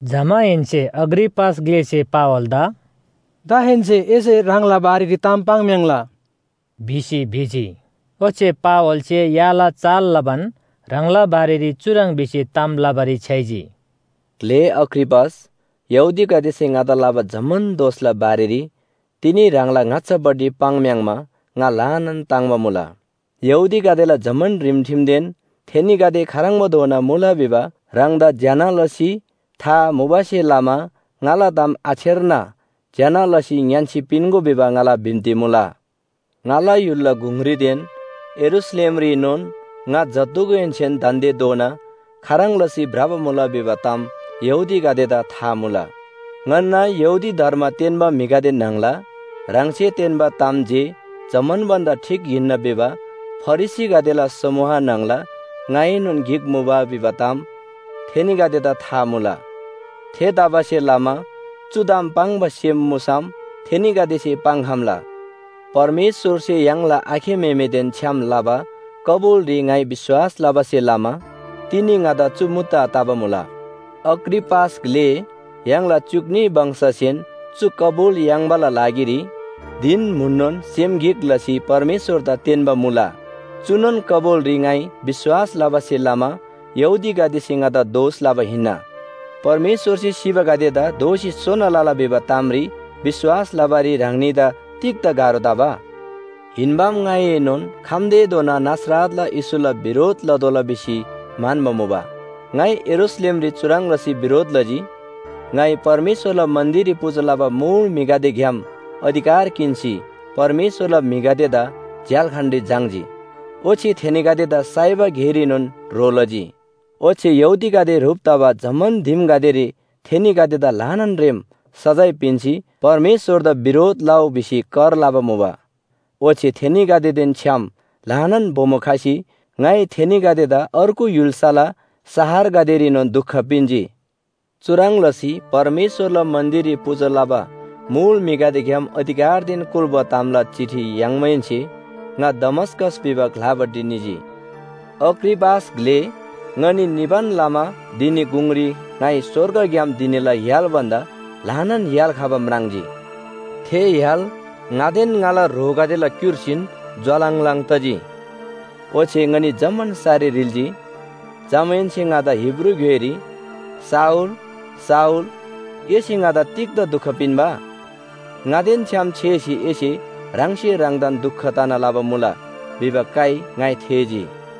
जमाहेन्‍से अग्रिपास ग्‍लेसे पावलदा “दाहेन्‍से एसे ह्राङला बारेरी ताम पाङ्‌म्‍याङ्‌ला” भिसी भिजी। ओच्‍छे पावलसे याला चाल लबान ह्राङला बारेरी चुह्रङ् भिसी ताम लबारी छ्‌याइजी। “ग्‍ले अग्रिपास, यहूदीगदेसे ङादा लबा जम्‍मान दोषला बारेरी तिनी ह्राङला ङाच्‍छापट्टि पाङ्‌म्‍याङ्‌मा ङा ल्‍हानान ताङ्‍बा मुला। यहूदीगदेला जम्‍मान रिमठिमदेन थेनीगदे खाह्रङ्‌बाधोना मुला भिबा ह्राङदा ज्‍यना लसी था मुबासे लमा ङाला ताम आछेर्ना ज्‍यना लसी ङ्‌यान्‍सी पिन्‍गो भिबा ङाला बिन्‍ती मुला। “ङाला य्‍हुलला गुङरीदेन यरूशलेमरीनोन ङा जत्‍धुगुहेन्‍से दान्‍देधोना खाह्रङ् लसी भ्रबा मुला भिबा ताम यहूदीगदेदा था मुला। ङन्‍ना यहूदी धर्म तेन्‍बा म्‍हिगदे न्‍हङला ह्राङसे तेन्‍बा ताम जे जम्‍मान भन्‍दा ठीक हिन्‍ना भिबा फरिसीगदेला समूह न्‍हङला ङाएनोन गिक मुबा भिबा ताम थेनीगदेदा था मुला। थेतबासेलमा चु ताम पाङ्बा सेम मुसम थेनीगदेसे पाङ्‌खम्‍ला। परमेश्‍वरसे य्‍हाङला आखे म्‍हेमेदेन छ्‌याम लबा कबुलरी ङाइ विश्‍वास लबासे लमा तिनी ङादा चु मुद्दा तबा मुला। अग्रिपास ग्‍ले य्‍हाङला च्‍युक न्‍ही वंशगदेसेन चु कबुल याङ्बाला लागिरी धिन म्‍हुननोन सेम गिक लसी परमेश्‍वरदा तेन्‍बा मुला। चुनोन कबुलरी ङाइ विश्‍वास लबासे लमा यहूदीगदेसे ङादा दोष लबा हिन्‍ना। परमेश्‍वरसे सिबागदेदा दोःसी सोना लला भिबा तामरी विश्‍वास लबारी ह्राङनीदा तिग्‍दा गाह्रो तबा? “हिन्‍बाम ङाइनोन खम्‍तेधोना नासरतला येशूला बिरोध लतोःला भिसी म्‍हन्‍बा मुबा। ङाइ यरूशलेमरी चुह्रङ् लसी बिरोध लजी। ङाइ परमेश्‍वरला मन्‍दिररी पूजा लबा मुल म्‍हिगदेग्‍याम अधिकार किन्‍सी परमेश्‍वरला म्‍हिगदेदा झ्‍याल्‍खानरी झाङ्‌जी। ओच्‍छे थेनीगदेदा साइबा गेरीनोन ह्रो लजी। ओच्‍छे यहूदीगदे ह्रुप तबा जम्‍मान दिमगदेरी थेनीगदेदा ल्‍हानान रेम सजाय पिन्‍सी परमेश्‍वरदा बिरोध लउ भिसी कर लबा मुबा। ओच्‍छे थेनीगदेदेन छ्‌याम ल्‍हानान बोमो खसी ङाइ थेनीगदेदा अर्गु य्‍हुल्‍साला शहरगदेरीनोन दुख पिन्‍जी। “चुह्रङ् लसी परमेश्‍वरला मन्‍दिररी पूजा लबा मुल म्‍हिगदेग्‍याम अधिकारदेन कुल्‍बा तामला चिठी याङ्माहेन्‍से ङा दमस्‍कस भिबा ग्‍लापट्टि निजी। अग्रिपास ग्‍ले, ङनी निबान लमा धिनी गुङरी ङाइ स्‍वर्गग्‍याम धिनीला य्‍हाल भन्‍दा ल्‍हानान य्‍हाल खबा म्राङ्जी। थे य्‍हाल ङादेन ङाला ह्रोगदेला क्‍युर्सीन ज्‍वालङलङ तजी। ओच्‍छे ङनी जम्‍मान सरी ह्रिल्‍जी। जमाहेन्‍से ङादा हिब्रू ग्‍योइरी “शाऊल, शाऊल एसे ङादा तिग्‍दा दुख पिन्‍बा? ङादेन छ्‌याम छेसी एसे ह्राङसे ह्राङदान दुख तना लबा मुला” भिबा काइ ङाइ थेःजी।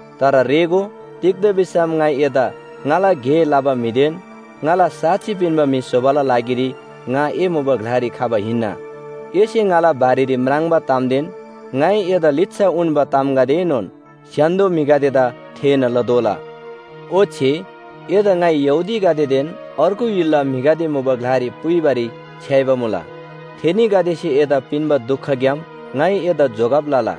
‘तर रेःगो, तिग्‍दा भिसम ङाइ एदा ङाला गे लबा म्‍हिदेन ङाला साक्षी पिन्‍बा म्‍हि स्‍होबाला लागिरी ङा ए मुबा ग्‍लारी खबा हिन्‍ना। एसे ङाला बारेरी म्राङ्बा तामदेन ङाइ एदा लिच्‍छा उन्‍बा तामगदेएनोन स्‍य्‍हान्‍दो म्‍हिगदेदा थेःना लतोःला। ओच्‍छे एदा ङाइ यहूदीगदेदेन अर्गु य्‍हुलला म्‍हिगदे मुबा ग्‍लारी पुइबारी छ्‌याइबा मुला। थेनीगदेसे एदा पिन्‍बा दुखग्‍याम ङाइ एदा जोगब लला।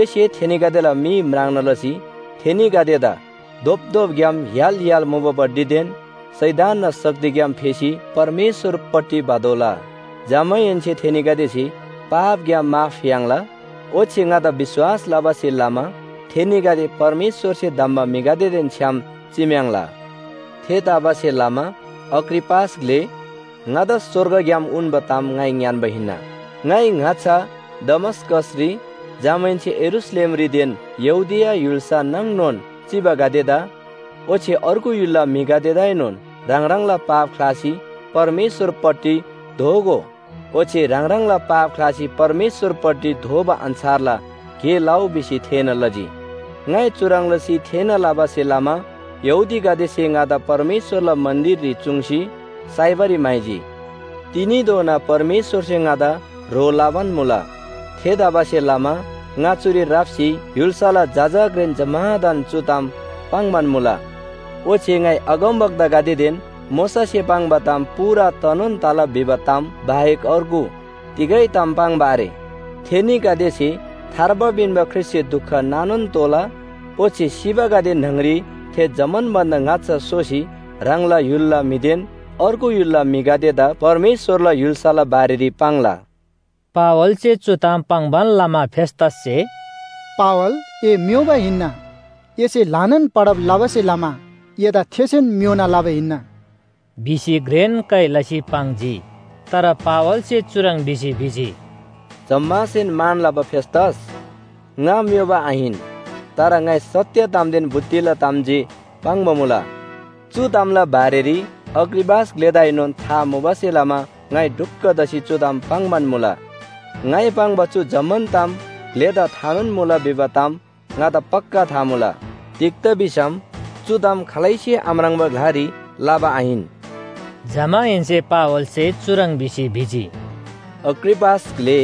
एसे थेनीगदेला मी म्राङ्ना लसी थेनीगदेदा धोपधोपग्‍याम य्‍हाल य्‍हाल मुबापट्टिदेन शैतानना शक्तिग्‍याम फेसी परमेश्‍वरपट्टि भतोःला। जमाहेन्‍से थेनीगदेसे पापग्‍याम माफ याङ्ला ओच्‍छे ङादा विश्‍वास लबासे लमा थेनीगदे परमेश्‍वरसे धम्‍बा म्‍हिगदेदेन छ्‌याम चिम्‍याङ्ला। “थेतबासेलमा अग्रिपास ग्‍ले, ङादा स्‍वर्गग्‍याम उन्‍बा ताम ङाइ ङ्‌यान्‍बा हिन्‍ना। ङाइ ङाच्‍छा दमस्‍कसरी, जमाहेन्‍से यरूशलेमरीदेन यहूदिया य्‍हुल्‍सा नाङनोन चिबागदेदा, ओच्‍छे अर्गु य्‍हुलला म्‍हिगदेदाएनोन ह्राङ ह्राङला पाप ख्‍लासी परमेश्‍वरपट्टि दोःगो ओच्‍छे ह्राङ ह्राङला पाप ख्‍लासी परमेश्‍वरपट्टि दोःबा अन्‍छारला गे लउ भिसी थेःना लजी। ङाइ चुह्रङ् लसी थेःना लबासे लमा यहूदीगदेसे ङादा परमेश्‍वरला मन्‍दिररी चुङ्सी साइबारी म्‍हाइजी। तिनीधोना परमेश्‍वरसे ङादा ह्रो लबान मुला। थेतबासेलमा ङा चुरी राप्‍सी य्‍हुल्‍साला जजा घ्रेन जम्‍मादान चु ताम पाङ्‌बान मुला। ओच्‍छे ङाइ अगमवक्तागदेदेन मोशासे पाङ्बा ताम पूरा तनोन तला भिबा ताम बाहेक अर्गु तिगै ताम पाङ्बा आरे। थेनीगदेसे थार्बा पिन्‍बा ख्रीष्‍टसे दुख नानोन तोःला, ओच्‍छे सिबागदे न्‍हङरी थे जम्‍मान भन्‍दा ङाच्‍छा सोसी ह्राङला य्‍हुलला म्‍हिदेन अर्गु य्‍हुलला म्‍हिगदेदा परमेश्‍वरला य्‍हुल्‍साला बारेरी पाङ्ला।” पावलसे चु ताम पाङ्‌बान लमा फेस्‍तससे “पावल ए म्‍योबा हिन्‍ना, एसे ल्‍हानान पढब लबासे लमा एदा थेसेन म्‍योना लबा हिन्‍ना” भिसी घ्रेन काइ लसी पाङ्जी। तर पावलसे चुह्रङ् भिसी भिजी, “जम्‍मासेन मान लबा फेस्‍तस, ङा म्‍योबा आहिन, तर ङाइ सत्‍य तामदेन बुद्धिला ताम जे पाङ्बा मुला। चु तामला बारेरी अग्रिपास ग्‍लेदाएनोन था मुबासे लमा ङाइ ढुक्‍क तसी चु ताम पाङ्‌बान मुला। ङाइ पाङ्बा चु जम्‍मान ताम ग्‍लेदा थानोन मुला भिबा ताम ङादा पक्‍का था मुला। तिग्‍दा भिसम चु ताम खालैसे आम्राङ्बा ग्‍लारी लबा आहिन।” जमाहेन्‍से पावलसे चुह्रङ् भिसी भिजी, “अग्रिपास ग्‍ले,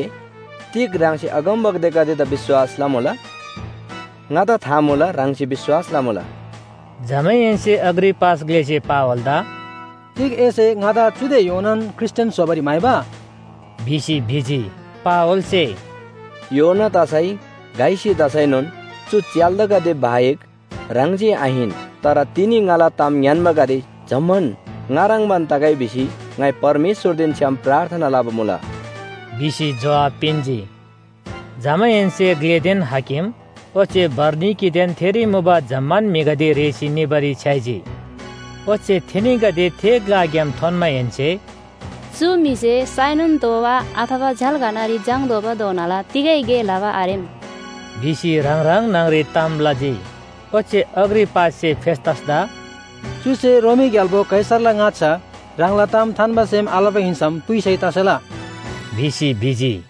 तिग ह्राङसे अगमवक्तागदेदा विश्‍वास लमुला? ङादा था मुला, ह्राङसे विश्‍वास लमुला।” जमाहेन्‍से अग्रिपास ग्‍लेसे पावलदा “तिग एसे ङादा चुदे योनान ख्रीष्‍टियान स्‍होबारी म्‍हाइबा?” भिसी भिजी। पावलसे “योना तसै घइसी तसैनोन चु च्‍याल्‍दागदे बाहेक, ह्राङ जे आहिन, तर तिनी ङाला ताम ङ्‌यान्‍बागदे जम्‍मान ङा ह्रङ्‌बान तगै भिसी ङाइ परमेश्‍वरदेन छ्‌याम प्रार्थना लबा मुला” भिसी जोहाब पिन्‍जी। जमाहेन्‍से ग्‍लेदेन हाकिम ओच्‍छे बरनिकीदेन थेरी मुबा जम्‍मान म्‍हिगदे रेःसी निबारी छ्‌याइजी। ओच्‍छे थेनीगदे थे ग्‍लाग्‍याम थोन्‍माहेन्‍से “चु म्‍हिसे साइनोन तोःबा अथवा झ्‍याल्‍खानरी झाङ्‌तोःबाधोनाला तिगै गे लबा आरेम” भिसी ह्राङ ह्राङ न्‍हङरी ताम लजी। ओच्‍छे अग्रिपाससे फेस्‍तसदा “चुसे रोमी ग्‍याल्‍बो कैसरला ङाच्‍छा ह्राङला ताम थान्‍बा सेम आलबा हिन्‍सम पुइसै तसेला” भिसी भिजी।